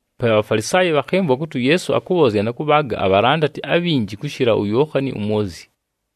Pe aBhafalisaayi bhakhɨmvwa kʉtɨ uYeesu akʉbhoozya na kʉbhaaga abhalandati abhinji kʉshɨla uYookhani uMwozyi.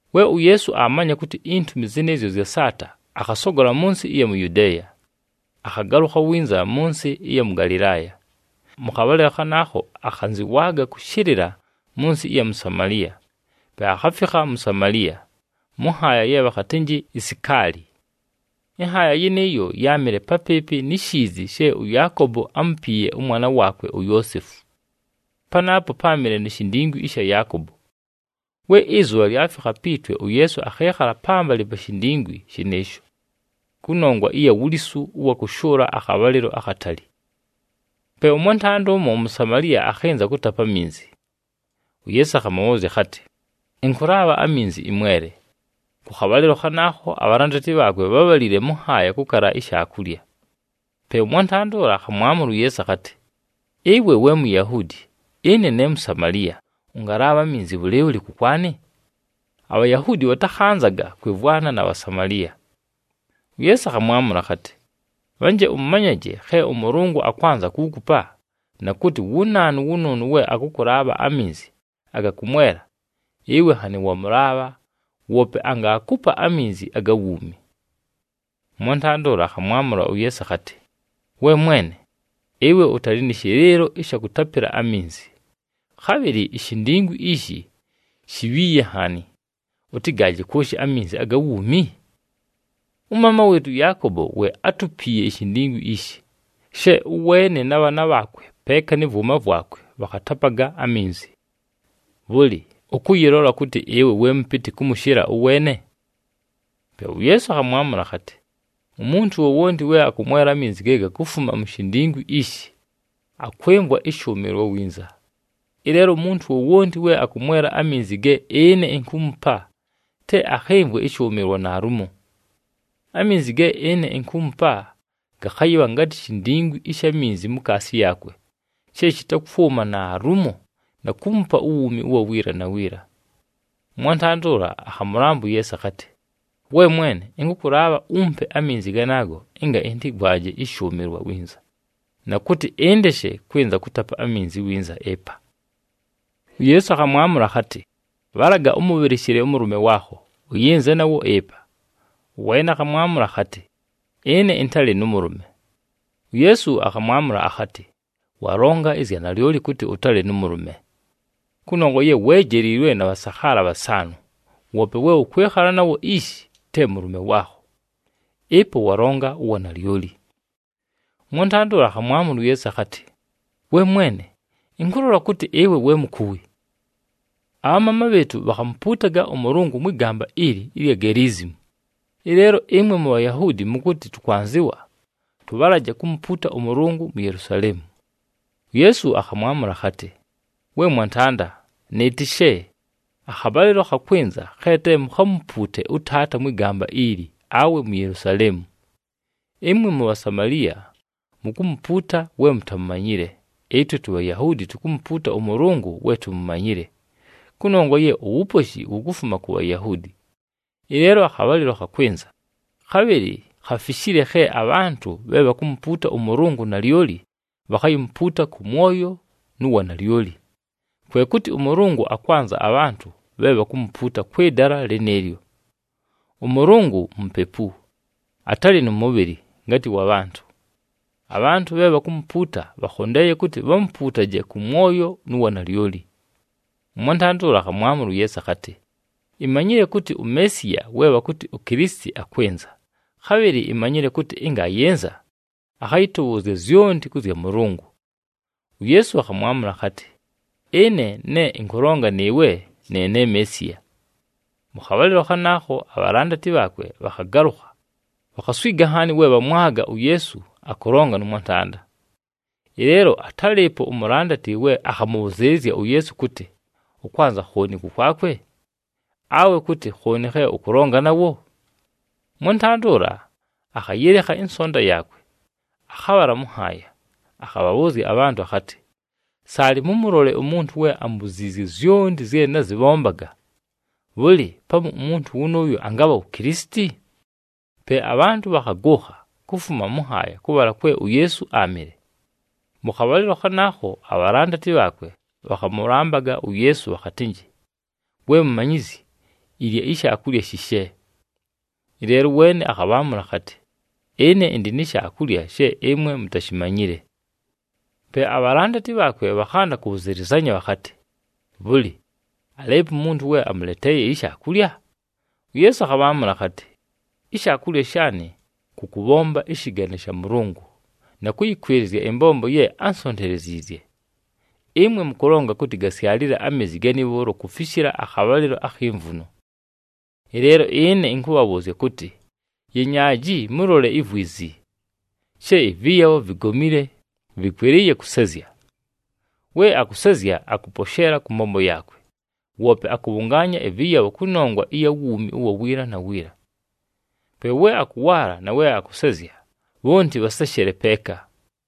We uYeesu aamanya kʉtɨ intumi zɨnɨɨzyo zyasaata, akhasogola mʉ nsɨ ɨya mu Yudeeya, akhagalʉkha winza mʉ nsɨ ɨya mʉ Galɨlaaya. Mʉ khabhalɨlo khanaakho akhanzɨwaaga kʉshɨlɨla mʉ nsɨ ɨya mu Samaliya. Pe akhafikha mu Samaliya, mʉ nhaaya ye bhakhatɨnjɨ iSikaali. Ɨnhaaya yɨnɨɨyo yáamɨle papɨɨpɨ ni shiizi she ʉYaakobo ámupiiye ʉmwana waakwe, uYoosefu. Panaapo páamɨle ni shindingwi ɨsha Yaakobo. We ɨzʉbha lyafikha pi twe, uYeesu akhɨɨkhala pambalɨ pa shindingwi shɨnɨɨsho, kʉnongwa ɨya wulisu ʉwa kʉshʉʉla akhabhalɨlo akhatali. Pe ʉmwantanda ʉmo uMusamaliya akhɨnza kʉtapa aminzi. UYeesu akhamʉbhʉʉzya akhatɨ, “Ɨnkʉlaabha aminzi ɨmwele.” Kʉ khabhalɨlo khanaakho abhalandati bhaakwe bhábhalile mʉ nhaaya kʉkala ishaakulya. Pe ʉmwantanda ʉla akhamwamʉla uYeesu akhatɨ, “Ɨwe we Muyahuudi, ɨne ne Musamaliya! Ʉngalaabha aminzi bhʉlɨɨbhʉlɨ kʉkwanɨ?” ABhayahuudi bhatakhanzaga kwɨmvwana na Bhasamaliya. UYeesu akhamwamʉla akhatɨ, “Bhanje ʉmanyaje khe ʉMʉlʉngʉ akwanza kuukupa na kʉtɨ wu naanu wʉnʉʉnʉ we akʉkʉlaabha aminzi aga kʉmwela, ɨwe nhanɨ wamʉlaabha, woope angaakupa aminzi aga wuumi.” Ʉmwantanda ʉla akhamwamʉla uYeesu akhatɨ, “We mwene, ɨwe ʉtalɨ nɨ shɨlɨɨlo ɨsha kʉtapɨla aminzi, khabhɨlɨ ishindingwi ishi shibhiiye nhaani, ʉtɨgaaje kwoshi aminzi aga wuumi? Ʉmaama wɨɨtʉ ʉYaakobo we átupiiye ishindingwi ishi, she ʉweene na bhaana bhaakwe peeka nɨ vwʉma vwakwe bhakhatapaga aminzi. Bhʉlɨ, ʉkʉyɨlola kʉtɨ ɨwe we mʉpɨtɨ kʉmʉshɨla ʉweene?” Pe uYeesu akhamwamʉla akhatɨ, “Umuntu wowonti we akʉmwela aminzi ge gakufuma mu shindingwi ishi, akwɨmvwa ɨshʉʉmɨlwa winza. Ɨleelo umuntu wowonti we akʉmwela aminzi ge ɨne inkuumupa, te akhɨmvwe ɨshʉʉmɨlwa naalumo. Aminzi ge ɨne inkuumupa, gakhayɨbha ngatɨ shindingwi ɨsha minzi mukaasi yaakwe she shɨtakwʉma naalumo na kuumupa uwuumi ʉwa wiila na wiila.” Ʉmwantanda ʉla akhamʉlamba uYeesu akhatɨ, “We mwene, ɨnkʉkʉlaabha umpe aminzi ganaago ɨnga ɨntɨmvwaje ɨshʉʉmɨlwa winza, na kʉtɨ ɨndeshe kwɨnza kʉtapa aminzi winza ɨpa!” UYeesu akhamwamʉla akhatɨ, “Bhalaga ʉmʉbhɨlɨshɨle ʉmʉlʉme waakho, ʉyɨnze nawo ɨpa.” Ʉweene akhamwamʉla akhatɨ, “Ɨne ɨntalɨ nʉ mʉlʉme.” UYeesu akhamwamʉla akhatɨ, “Walonga ɨzya nalyoli kʉtɨ ʉtalɨ nʉ mʉlʉme! Kʉnongwa ye weejeliilwe na bhasakhaala bhasaanʉ, woope we ʉkwɨkhala nawo ishi, te mʉlʉme waakho. Ɨpo walonga uwanalyoli.” Ʉmwantanda ʉla akhamwamʉla uYeesu akhatɨ, “We mwene, ɨnkʉlola kʉtɨ ɨwe we mukuwi. Abhamaama bhɨɨtʉ bhakhamupuutaga ʉMʉlʉngʉ mwɨ gamba ili ɨlya Geliizimu, ɨleelo ɨmwe muBhayahuudi mʉkʉtɨ tʉkwanzɨwa tʉbhalaje kumupuuta ʉMʉlʉngʉ mu Yelusaleemu.” UYeesu akhamwamʉla akhatɨ, “We mwantanda, nɨɨtɨshe, akhabhalɨlo khakwɨnza khe te mukhamupuute ʉTaata mwɨ gamba ili awe mu Yelusaleemu. Ɨmwe muBhasamaliya mukumupuuta we mutamumanyile, ɨtwe tuBhayahuudi tukumupuuta ʉMʉlʉngʉ we tumumanyile, kʉnongwa ye uwuposhi wukufuma ku Bhayahuudi. Ɨleelo akhabhalɨlo khakwɨnza, khabhɨlɨ khafishile khe abhantʉ bhe bhakumupuuta ʉMʉlʉngʉ nalyoli bhakhayimupuuta kʉ mwoyo nu wanalyoli. Kwe kʉtɨ ʉMʉlʉngʉ akwanza abhantʉ bhe bhakumupuuta kwɨ dala lɨnɨɨlyo. ɄMʉlʉngʉ Mupepu, atalɨ nʉ mʉbhɨlɨ ngatɨ wa bhantʉ. Abhantʉ bhe bhakumupuuta, bhakhondeeye kʉtɨ bhamupuutaje kʉ mwoyo nu wanalyoli.” Ʉmwantanda ʉla akhamwamʉla uYeesu akhatɨ, “Imanyile kʉtɨ uMeesiya we bhakʉtɨ uKilisiti akwɨnza. Khabhɨlɨ imanyile kʉtɨ ɨnga ayɨnza, akhayɨtʉbhʉʉzya zyonti kʉ zya Mʉlʉngʉ.” UYeesu akhamwamʉla akhatɨ, “Ɨne ne ɨnkʉlonga nɨɨwe, ne ne Meesiya.” Mʉ khabhalɨlo khanaakho, abhalandati bhaakwe bhakhagalʉkha, bhakhaswiga nhaani we bhamwaga uYeesu akʉlonga nʉ mwantanda. Ɨleelo atálɨɨpo umulandati we akhamʉbhʉzɨɨlɨzya uYeesu kʉtɨ, “Ʉkwanza khooni kʉkwakwe?” Awe kʉtɨ, “Khooni khe ʉkʉlonga nawo?” Ʉmwantanda ʉla akhayɨlekha ɨnsonta yaakwe, akhabhala mʉ nhaaya, akhabhabhʉʉzya abhantʉ akhatɨ, “Saalɨ mʉmʉlole umuntu we ambuziizye zyonti zye nazɨbhombaga! Bhʉlɨ, pamu umuntu wʉnʉʉyo angabha wu Kilisiti?” Pe abhantʉ bhakhagʉʉkha, kufuma mʉ nhaaya kʉbhala kwe uYeesu áamɨle. Mʉ khabhalɨlo khanaakho, abhalandati bhaakwe bhakhamʉlambaga uYeesu bhakhatɨnjɨ, “We Mumanyizyi, ilya ishaakulya shishe.” Ɨleelo ʉweene akhabhaamʉla akhatɨ, “Ɨne ɨndɨ ni shaakulya she ɨmwe mutashimanyile.” Pe abhalandati bhaakwe bhakhanda kʉbhʉzɨlɨzanya bhakhatɨ, “Bhʉlɨ, alɨɨpo umuntu we amʉleteeye ishaakulya?” UYeesu akhabhaamʉla akhatɨ, “Ishaakulya shaanɨ kʉ kʉbhomba ɨshɨgane sha Mʉlʉngʉ, na kʉyɨkwɨlɨzya ɨmbombo ye ánsonteleziizye. Ɨmwe mʉkʉlonga kʉtɨ, ‘Gasyalile ameezi gani bhʉʉlo kufishila akhabhalɨlo akhi mvuno.’ Ɨleelo ɨne ɨnkʉbhabhʉʉzya kʉtɨ, yenyaaji mʉlole ivwizi, she ɨvɨyabho vigomile, vɨkwɨlɨɨye kʉsezya. We akʉsezya akʉposheela kʉ mbombo yaakwe, woope akʉbhʉngaanya ɨvɨyabho kʉnongwa ɨya wuumi ʉwa wiila na wiila. Pe we akʉwaala na we akʉsezya, bhonti bhaseshele peeka.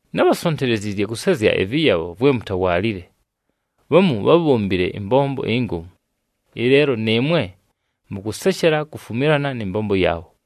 Nábhasonteleziizye kʉsezya ɨvɨyabho vwe mutawaalile. Bhamu bhábhombile ɨmbombo ingomu. Ɨleelo nɨɨmwe mʉkʉseshela kufumilana nɨ mbombo yaabho.”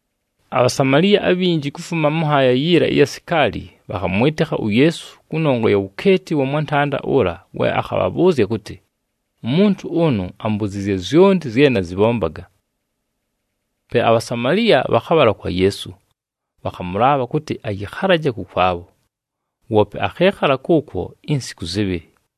ABhasamaliya abhinji kufuma mʉ nhaaya yiila ɨya Sikaali bhakhamwɨtɨkha uYeesu kʉnongwa ya wukeeti wa mwantanda ʉla we akhabhabhʉʉzya kʉtɨ, “Umuntu ʉnʉ ambuziizye zyonti zye nazɨbhombaga.” Pe aBhasamaliya bhakhabhala kwa Yeesu, bhakhamʉlaabha kʉtɨ ayɨkhalaje kʉkwabho. Woope akhɨɨkhala kʉʉkwo insiku zɨbhɨlɨ.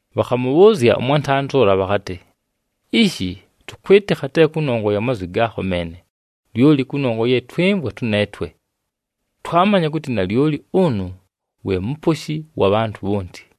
Bhakhamʉbhʉʉzya ʉmwantanda ʉla bhakhatɨ, “Ishi, tʉkwɨtɨkha te kʉnongwa ya mazwi gaakho meene, lyoli kʉnongwa ye twɨmvwa tʉneetwe. Twamanya kʉtɨ nalyoli ʉnʉ we Muposhi wa bhantʉ bhonti.”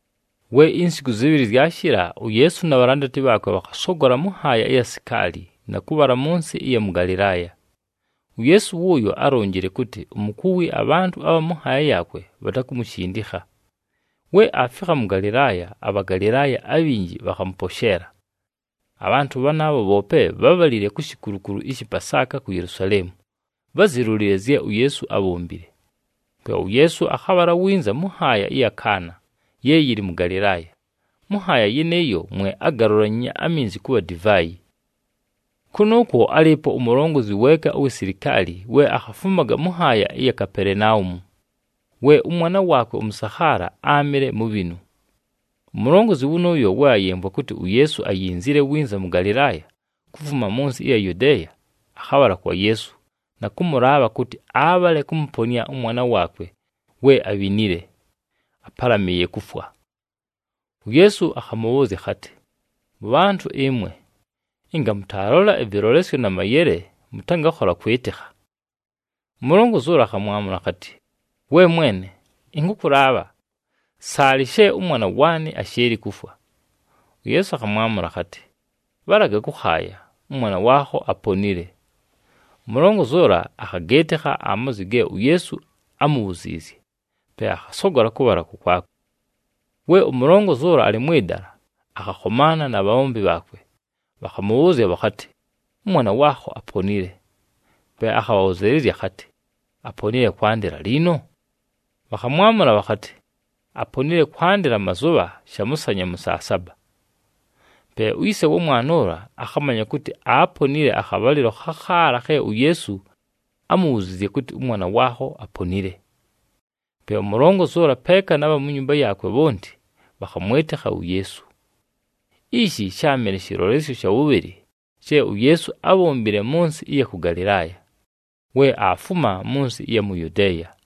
We insiku zɨbhɨlɨ zyashɨla, uYeesu na bhalandati bhaakwe bhakhasogola mʉ nhaaya ɨya mu Sikaali na kʉbhala mʉ nsɨ ɨya mʉ Galɨlaaya. UYeesu wʉʉyo álonjile kʉtɨ umukuwi abhantʉ abha mʉ nhaaya yaakwe bhatakumushindikha. We aafikha mʉ Galɨlaaya, aBhagalɨlaaya abhinji bhakhamʉposheela. Abhantʉ bhanaabho bhoope bhábhalile ku shikulukulu ɨshɨ Pasaaka ku Yelusaleemu, bházilolile zye uYeesu ábhombile. Pe uYeesu akhabhala winza mʉ nhaaya ɨya mʉ Kaana ye yɨlɨ mʉ Galɨlaaya. Mʉ nhaaya yɨnɨɨyo mwe ágalulanyiinye aminzi kʉbha divaayi. Kʉnʉʉkwo álɨɨpo umulongozi weeka uwi silikaali we akhafumaga mʉ nhaaya ɨya mu Kapelenaumu we ʉmwana waakwe ʉmʉsakhaala áamɨle mubhinu. Umulongozi wʉnʉʉyo we ayɨmvwa kʉtɨ uYeesu ayinzile winza mʉ Galɨlaaya kufuma mʉ nsɨ ɨya Yudeeya, akhabhala kwa Yeesu na kʉmʉlaabha kʉtɨ abhale kʉmʉponɨa ʉmwana waakwe we abhinile, ápalamɨɨye kufwa. UYeesu akhamʉbhʉʉzya akhatɨ, “Mʉbhantʉ ɨmwe, ɨnga mʉtaalola ɨvɨlolesyo na mayele mʉtangakhola kwɨtɨkha!” Umulongozi ʉla akhamwamʉla akhatɨ, “We mwene, ɨnkʉkʉlaabha, saalɨ she ʉmwana waanɨ ashɨɨlɨ kufwa.” UYeesu akhamwamʉla akhatɨ, “Bhalaga kʉkhaaya, ʉmwana waakho aponile.” Umulongozi ʉla akhagɨɨtɨkha amazwi ge uYeesu ámubhuziizye, pe akhasogola kʉbhala kʉkwakwe. We umulongozi ʉla alɨ mwɨ dala, akhakhomaana na bhabhombi bhaakwe. Bhakhamʉbhʉʉzya bhakhatɨ, “Ʉmwana waakho aponile.” Pe akhabhabhʉzɨɨlɨzya akhatɨ, “Aponile kwandɨla liino?” Bhakhamwamʉla bhakhatɨ, “Aponile kwandɨla mazʉbha shamʉsanya mʉ saa saba.” Pe uyise wa mwana ʉla akhamanya kʉtɨ aaponile akhabhalɨlo khakhaala khe uYeesu ámubhuziizye kʉtɨ, “Ʉmwana waakho aponile.” Pe umulongozi ʉla peeka na bha mu nyumba yaakwe bhonti bhakhamwɨtɨkha uYeesu. Ishi sháamɨle shɨlolesyo sha wʉbhɨlɨ she uYeesu ábhombile mʉ nsɨ ɨya kʉ Galɨlaaya we aafuma mʉ nsɨ ɨya mu Yudeeya.